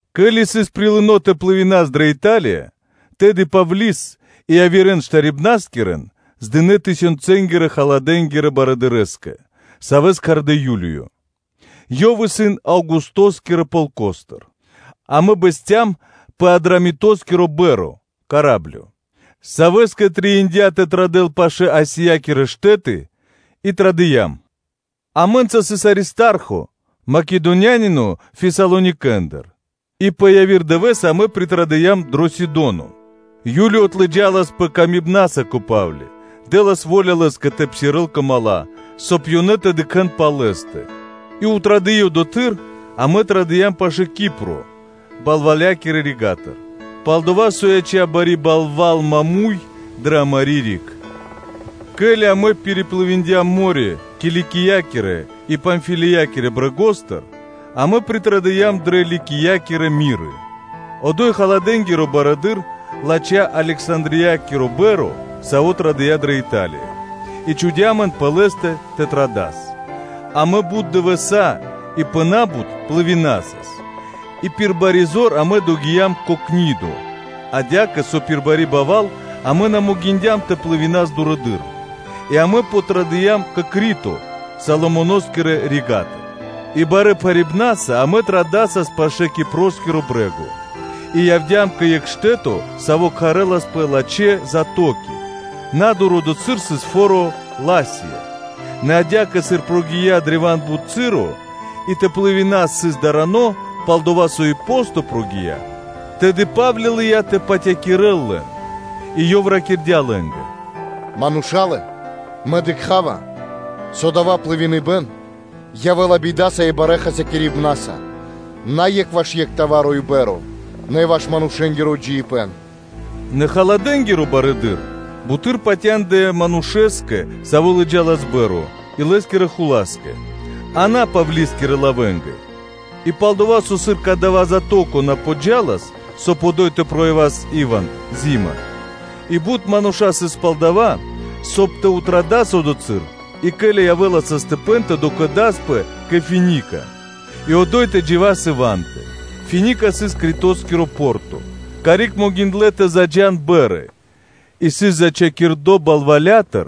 Ке́ли сыс прилыно тэ плывинас (дас пли́ма) дрэ Италия, тэды Павли́с и явирэ́н штарибнаскирэн здынэ тысенцэнгирэ-халадэ́нгирэ барыдырэ́скэ, савэ́с кхардэ́ Юлиё, ёв исын Аугустоскирэ полкостыр. Амэ бэсцям пэ Адрамитоскири па́рма (кораблё), савэ́скэ трэиндя́ тэ традэл пашы́л Азиякирэ штэ́ты и традыям, амэ́нца сыс Аристархо, Македонянино Фесалоникэндыр. И пэ яви́р дывэ́с амэ притрадыям дро Сидоно. Юлиё отлыджаласпэ илэ́са кэ Па́вли, дэ́лас во́ля лэ́скэ тэ псирэ́л кэ дру́ги (мала́), соб (кай) ёнэ тэ дыкхэ́н пал лэ́стэ. И традыи одотхы́р, амэ традыям пашы́л Кипро балвалякирэ рига́тыр, пал-дова́ со яця́ бари балва́л маму́й (прямэс) дрэ амари́ риг. Ке́ли амэ пириплывиндям (дыям плима) мо́рё (дэрья́в) Киликиякирэ и Памфилиякирэ брэгостыр, амэ притрадыям дрэ Ликиякирэ Миры: одо́й халадэ́нгиро барыдыро́, латхя́ Александриякири па́рма, сави́ традыя́ кэ Италия, и чхудя́ амэн пэ ла́тэ тэ традас. Амэ бут дывэса́ и пэ на́бут плывинасас (дасас плима), и пир бари зор амэ догиям кэ Книдо адя́кэ, со пир бари балва́л амэ на могиндям тэ плывинас дурэды́р, и амэ подтрадыям кэ Крито Салмоноскирэ рига́тыр. И барэ́ пхарипнаса амэ традасас пашы́л Кипроскиро брэ́го, и явдя́м кэ екх штэ́то, саво́ кхарэнас Лачхэ́ Пристани (Затоки), на́дур одотхы́р сыс фо́ро Ласея. Нэ адя́кэ, сыр прогия́ древа́н бут часо, и тэ плывинэс сыс дарано, пал-дова́ со и посто прогия́, тэды Па́вли лыя́ тэ патякирэл лэн, и ёв ракирдя́ лэ́нгэ: “Мурша́лэ! Мэ дыкха́ва, со дава́ плывиныбэн явэ́ла бидаса и барэ́ хасякирибнаса на екх ваш екх пхарипэн (грузо) и па́рма, нэ и ваш манушэ́нгиро джиибэ́н.” Нэ халадэ́нгиро барыдыро́ бутэды́р патяндыя манушэ́скэ, саво́ лыджалас па́рма и лэ́скирэ хула́скэ, а на Павлискирэ лавэнгэ. И пал-дова́ со, сыр кадава́ затоко на подджалас, соб (кай) одо́й тэ явас саро́/и́ ивант (зима), и бут мануша́ сыс пал дова́, соб (кай) тэ традас криг одотхы́р, и, ко́ли тэ явэ́л саштыпэн тэ докэдаспэ кэ Финика и одо́й тэ джива́с ивантэ (зимакиро), Финика сыс Критоскиро порто, карик могиндлэ́ тэ заджа́н па́рмы, и сыс зачхакирдо балвалятыр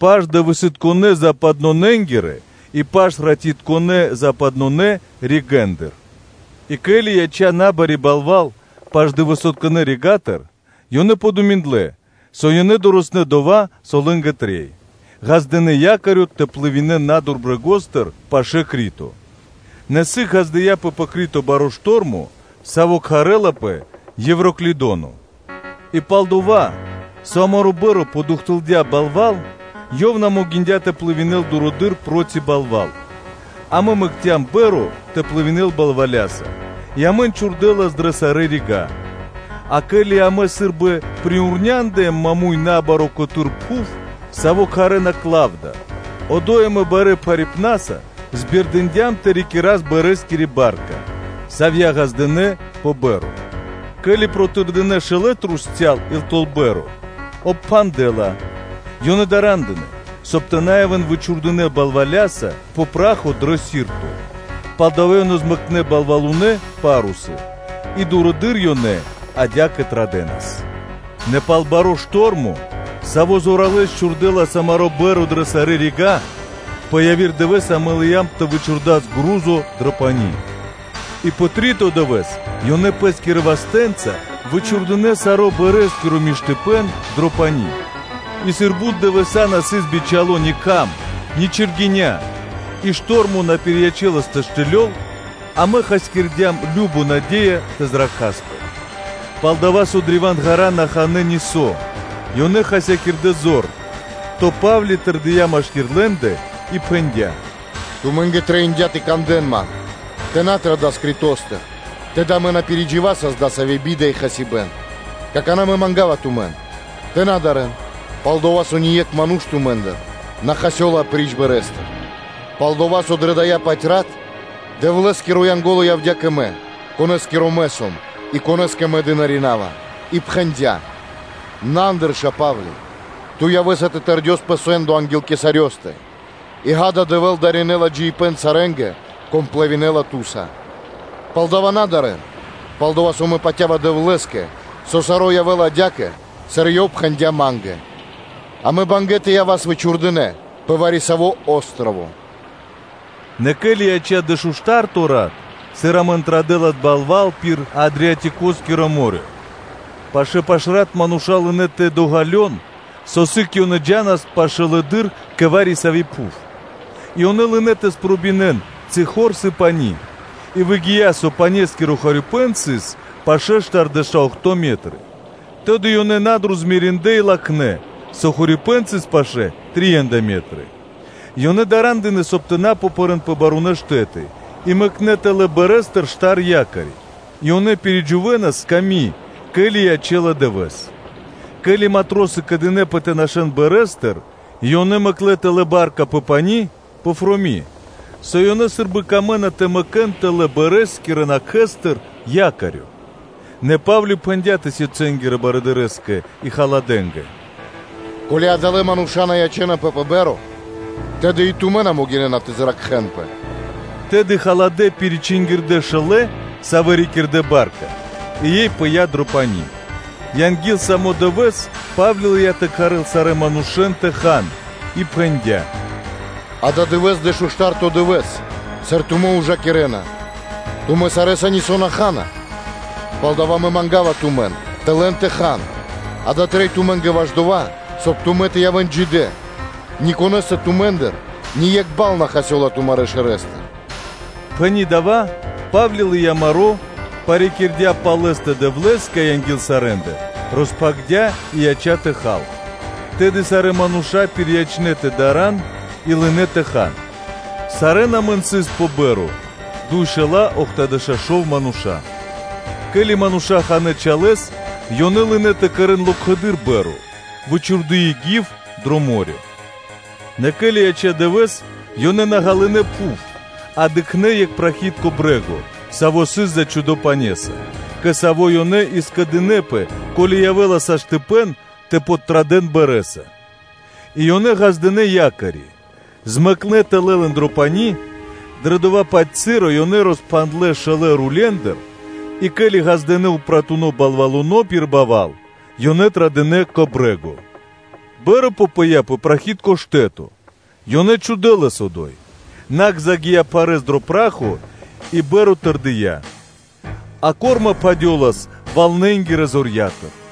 паш-дывэсытконэ́-западнонэнгирэ и паш-ратитконэ́-западнонэ ригэ́ндыр. Што́рмо пэ Мо́рё (Дэрья́в) И ке́ли яця́ набари балва́л паш-дывэсытконэ́ рига́тыр, ёнэ подуминдлэ, со ёнэ дорэснэ́ дова́, со лэ́нгэ трэй, ґаздынэ́ якорё тэ плывинэн (тэ дэн плима) на́дур брэгостыр пашы́л Крито. Нэ сыг ґаздыя́пэ пэ Крито баро́ штормо, саво́ кхарэ́лапэ Евроклидоно. И пал-дова́, со амари́ па́рма подухтылдя балва́л, ёй на могиндя́ тэ плывинэл (тэ дэл плима) дурэды́р проти балва́л, амэ мэкцям па́рма тэ плывинэл (дэл пли́ма) балваляса и амэн чхурдэлас дрэ сарэ́ рига́. А ке́ли амэ сы́рбы пириурняндыям маму́й набаро́ котэ́р пхув, саво́ кхарэ́на Клавда, одо́й амэ барэ́ пхарипнаса пиризорьякирдям (збердындям) тэ рикирас пармакири ба́рка (лодка), савья́ ґаздынэ́ пэ па́рма, ке́ли протырдынэ шолэ трусця́л и тэл па́рма и обпхандлэ́ ла; ёнэ дара́ндынэ, соб (кай) тэ на явэ́н вычхурдынэ балваляса пэ пра́хо дрэ Сирто, палдава́ ёнэ змэкнэ балвалунэ́ (па́русы) и дурэды́р ёнэ адя́кэ традэнас. Нэ пал баро́ штормо, саво́ зоралэ́с чхурдэлас амари́ па́рма дрэ сарэ́ рига́, пэ яви́р дывэ́с амэ лыям тэ вычхурдас пхарипэ́н (грузо) дро пани́, а пэ три́то дывэ́с ёнэ пэ́скирэ вастэ́нца вычхурдынэ саро́ пармакиро миштыпэ́н (оснашчэниё) дро пани́. И сыр бут дывэса́ на сыс бицяло́ ни кхам, ни чэргэня́, и штормо на пириячэлас тэ штылёл; амэ хасякирдям кажно наде́я тэ зракхаспэ. Палдава́ со древа́н ґара́ на ханэ́ нисо́, ёнэ хасякирдэ́ зор, то Па́вли тэрдия́ машкира́л лэ́ндэ, и пхэндя́: “Тумэ́нгэ трэиндя́ тэ кандэ́н ман: тэ на традас Критостыр, тэды амэ на пиридживасас дасави́ би́да и хасибэ́н. Какана́ Мэ манга́ва тумэн, тэ на дарэ́н, пал-дова́ со ни екх ману́ш тумэ́ндыр на хасёла апри́ч па́рма. Палдова́ со дрэ дая́-паць рат Дэвлэ́скиро Янго́ло явдя́ кэ мэ, Конэ́скиро мэ сом и Конэ́скэ мэ дынаринава, и пхэндя́: “На андырша, Павле! Ту явэ́са тэ тэрдёс пэ сэ́ндо анги́л кхенинго́стэ (кесарёстэ); и, ґа́да, Дэвэ́л даринэла джиибэ́н сарэ́нгэ, кон плывинэла (дэла плима) ту́са.” Палдава́ на дарэ́н, пал-дова́ со мэ патя́ва Дэвлэ́скэ, со саро́ явэ́ла адя́кэ, сыр Ёв пхэндя́ ма́нгэ. Амэ сам бангэ́ тэ явас вычхурдынэ пэ вари-саво́ о́строво (джип).” Нэ ке́ли яця́ дэшуштарто рат, сыр амэн традэлас балва́л пир Адриатикоскиро (Адриатическо) мо́рё (дэрья́в), пашы́л пашрат мануша́ лынэ́ тэ ґалён, со сыг ёнэ джа́нас пашылэды́р кэ вари-сави́ пхув, ёнэ и лынэ́ тэ спробинэн, ци хор сыс пани́, и выгия́, со панескиро хорипэ́н сыс пашэ́ штардэша́ охто́ метры, тэды ёнэ на́дур змериндлэ и латхнэ́, со хорипэ́н сыс пашэ́ трия́нда метры; ёнэ дара́ндынэ, соб (кай) тэ на попэрэн пэ барунэ́ штэ́ты, и мэкнэ́ тэлэ́ парма́тыр штар якори, и ёнэ ужакирэнас, ке́ли ячэ́ла дывэ́с. Ке́ли матросы скэдынэ́пэ тэ нашэ́н парма́тыр и ёнэ мэкнэ́ тэлэ́ ба́рка пэ пани́, пэфроми, со ёнэ сы́рбы камэ́на тэ мэкэ́н тэлэ́ пармакирэ накхэстыр якорё, нэ Па́вли пхэндя́ тысёнцэнгирэ барыдырэ́скэ и халадэнгэ: “Ко́ли адалэ́ мануша́ на ячэ́напэ пэ па́рма, тэды и тумэ́ на могинэ́на тэ зракхэнпэ.” Тэды халадэ́ пиричингирдэ шэлэ, савэ́ рикирдэ ба́рка, и ёй пыя́ дро пани́. Анги́л са́мо дывэ́с, Па́вли лыя́ тэ кхарэл сарэ́н манушэ́н тэ хан и пхэндя́: “Ададывэ́с дэшуштарто дывэ́с, сыр тумэ́ ужакирэ́на, тумэ́ сарэ́са нисо́ на ха́на. Палдава́ мэ манга́ва тумэн тэ лэн тэ хан; дава́ трэй тумэ́нгэ ваш дова́, соб (кай) тумэ́ тэ явэ́н джидэ́; ни конэ́стэ тумэ́ндыр ни екх бал на хасёла тумарэ́ шэрэстыр.” Пхэни́ дава́, Па́вли лыя́ маро́, парикирдя пал лэ́стэ Дэвлэ́скэ анги́л сарэ́ндэ, роспхагирдя́ и яця́ тэ хал. Тэды сарэ́ мануша́ пириячнэ тэ дарэ́н и лынэ́ тэ хан. Сарэ́н амэн сыс пэ па́рма дуйшэла́ охтодэша́ шов мануша́. Ке́ли мануша́ ханэ́ чалэ́с, ёнэ лынэ́ тэ кэрэ́н локхэды́р па́рма, вычхурдыи гив дро мо́рё (дэрья́в). Нэ ке́ли яця́ дывэ́с, ёнэ на ґалынэ́ пхув, а дыкхнэ́ екх прахитко брэ́го, саво́ сыс зачхудо пане́са, кэ саво́ ёнэ и скэдынэ́пэ, ко́ли явэ́ла сашты́ (можно), тэ традэ́н пашылэды́р пармаса. И ёнэ ґаздынэ́ якори, мэкнэ́ тэлэ́ лэн дро пани́, дрэ дова́-паць часо ёнэ роспхандлэ шолэ рулендыр и, ке́ли ґаздынэ́ упратуно балвалуно (парусо) пир балва́л, ёнэ традынэ кэ брэ́го. Па́рма попыя пэ прахитко штэ́то, ёнэ чхудэ́ лэс одо́й. Накх загия́ пхарэ́с дро пра́хо и па́рма тэрдия́, а корма пхадёлас валнэнгирэ зорья́тыр.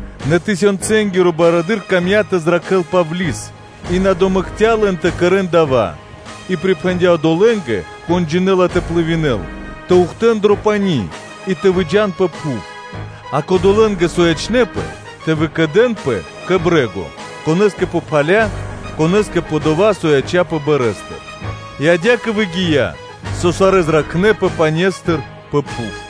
Нэ тысёнцэнгиро барыдыро́ камдя́ тэ зракхэ́л Павли́с и на домэкця лэн тэ кэрэ́н дава́ и припхэндя́ одолэ́нгэ, кон джинэ́ла тэ плывинэл, тэ ухтэн дро пани́ и тэ выджа́н пэ пхув, а кодолэ́нгэ, со ячнэ́пэ, тэ выкэдэнпэ кэ па́рма, конэ́скэ пэ пхаля, а конэ́скэ пэ дова́, со яця́пэ парма́тыр, и адя́кэ выгия́, со сарэ́ зракхнэпэ пане́стыр пэ пхув.